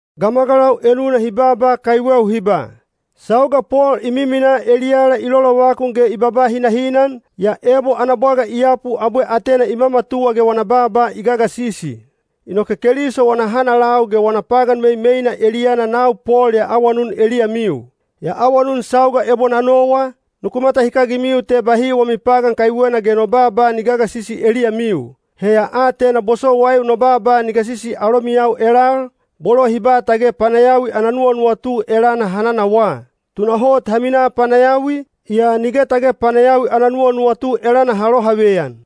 Gamagalau enuna hi baaba kaiweu hi ba, “Sauga Pol i miminaa eliyala i lolovakun ge i babaa hinahinan, yaa ebo ana bwaga i yapu abwe atena i mamatuwa ge wana baaba i gagasisi.” Inoke Keliso wana hanalau ge wana pagan meimeina eliyana nau Pol ya awanun eliyamiu. Ya awanun sauga ebo na nowa, nuku matahikagimiu te bahi wami pagan kaiwena ge no baaba ni gagasisi eliyamiu. He ya atena bosowaiu no baaba ni gasisi alomiyau elal, bolo hi ba tage panayawi ana nuwanuwatu elana ha nanawaa. Tunahot ha minaa panayawi, yaa nige tage panayawi ana nuwanuwatu elana ha lohaveyan.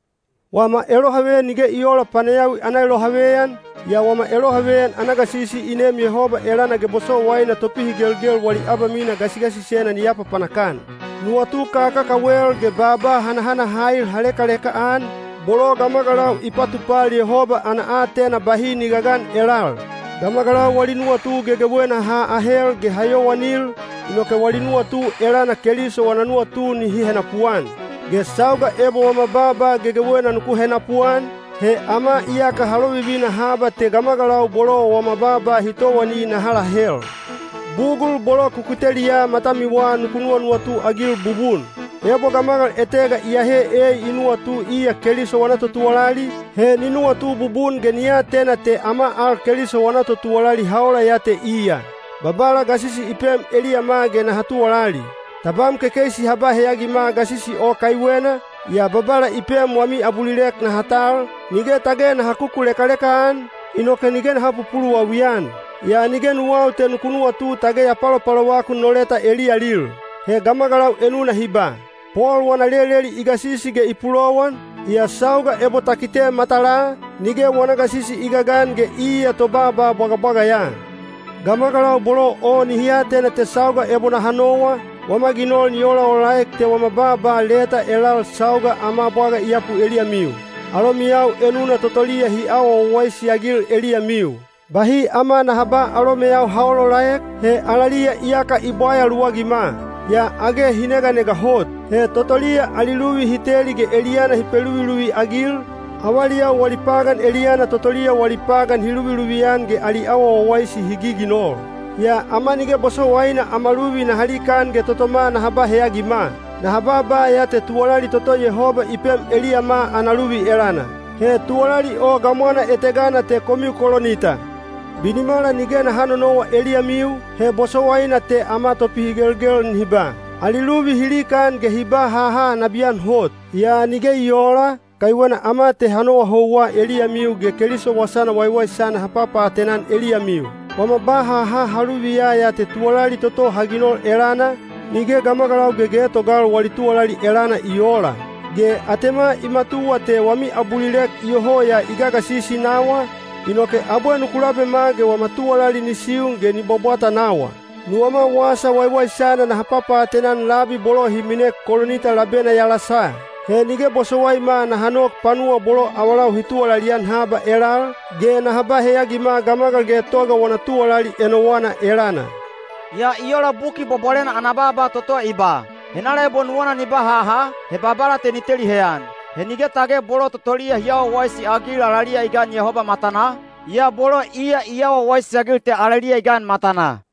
Wama elohaveyan nige i oola panayawi ana elohaveyan, yaa wama elohaveyan ana gasisi i neem Yehoba elana ge bosowaina topihigelgel wali abamina gasigasisena ni apapanak-an. Nuwatu kakakawel ge baaba hanahanahail ha lekaleka-an, bolo gamagalau i patupal Yehoba ana aatena bahi ni gagan elal. Gamagalau wali nuwatu gegewena ha ahel ge ha yowanil, inoke wali nuwatu elana Keliso wana nuwatu nihi henapuan. Ge sauga ebo wama baaba gegewena nuku henapuan, he ama iyaka ha lovivina haba te gamagalau bolo wama baaba hi towani naha lahel. Bugul bolo ku kiteliya matamiwa nuku nuwanuwatu-agil bubun! Ebo gamagal etega iyehe ei i nuwatu iya Keliso wana totuwalali, he ni nuwatu bubun ge ni atena te ama al Keliso wana totuwalali ha ola ya te iya. Babala gasisi i pem eliyama ge naha tuwalali. Tabam kekeisi ha ba heyagima gasisi o kaiwena, yaa Babala i pem wami abulilek naha tal, nige tage naha kukulekaleka-an, inoke nige naha pupuluwawi-an. Yaa nige nuwau te nuku nuwatu tage ya palopalovakun no leta eliyalil. He gamagalau enuna hi ba, “Pol wana leleli i gasisi ge i pulowan, yaa sauga ebo ta kite matalaa, nige wana gasisi i gagan ge iya tobaaba bwagabwaga ya.” Gamagalau bolo o nihi atena te sauga ebo naha nowa, wama ginol ni olaolaek te wama baaba leta elal sauga ama bwaga i yapu eliyamiu. Alomiyau enuna totoliya hi awa wawaisi-agil eliyamiu. Bahi ama naha ba alomeyau ha olaolaek, he alaliya iyaka i bwaya luwagima! Yaa age hi neganega hot. He totoliya ali luvi hi teli ge eliyana hi peluviluvi-agil, avaliyau wali pagan eliyana totoliya wali pagan hi luviluvi-an ge ali awa wawaisi hi giginol. Yaa ama nige bosowaina ama luvi naha likaan ge totoma naha ba heyagima. Naha babaa ya te tuwalali toto Yehoba i pem eliyama ana luvi elana. He tuwalali o gamwana etegana te komiu Kolinita. Binimala nige naha nonowa eliyamiu, he bosowaina te ama topihigelgel nihi ba, “Ali luvi hi likaan ge hi ba haha nabiyan hot.” Yaa nige i oola, kaiwena ama te ha nowa houwa eliyamiu ge Keliso Wasana Waiwaisana ha papaatena-an eliyamiu. Wama ba haha ha luviya ya te tuwalali toto ha ginol elana, nige gamagalau gegetogal wali tuwalali elana i oola. Ge atema i matuwa te wami abulilek iyoho ya i gagasisi nawa, inoke abwe nuku labema ge wama tuwalali ni siun ge ni bwabwata nawa. Nuwama Wasa Waiwaisana naha papaatena-an labi bolo hi minek Kolinita labena yalasa. He nige bosowaima naha nok panuwa bolo avalau hi tuwalali-an haba elal, ge naha ba heyagima gamagal getoga wana tuwalali enowana elana. Yaa i ola Buki Bwabwalena ana baaba toto i ba, “Henala ebo nuwana ni ba haha, he Babala te ni teli heyan.” He nige tage bolo totoliya hi awa wawaisi-agil alaliya i gan Yehoba matanaa, yaa bolo iya i awa wawaisi-agil te alaliya i gan matanaa.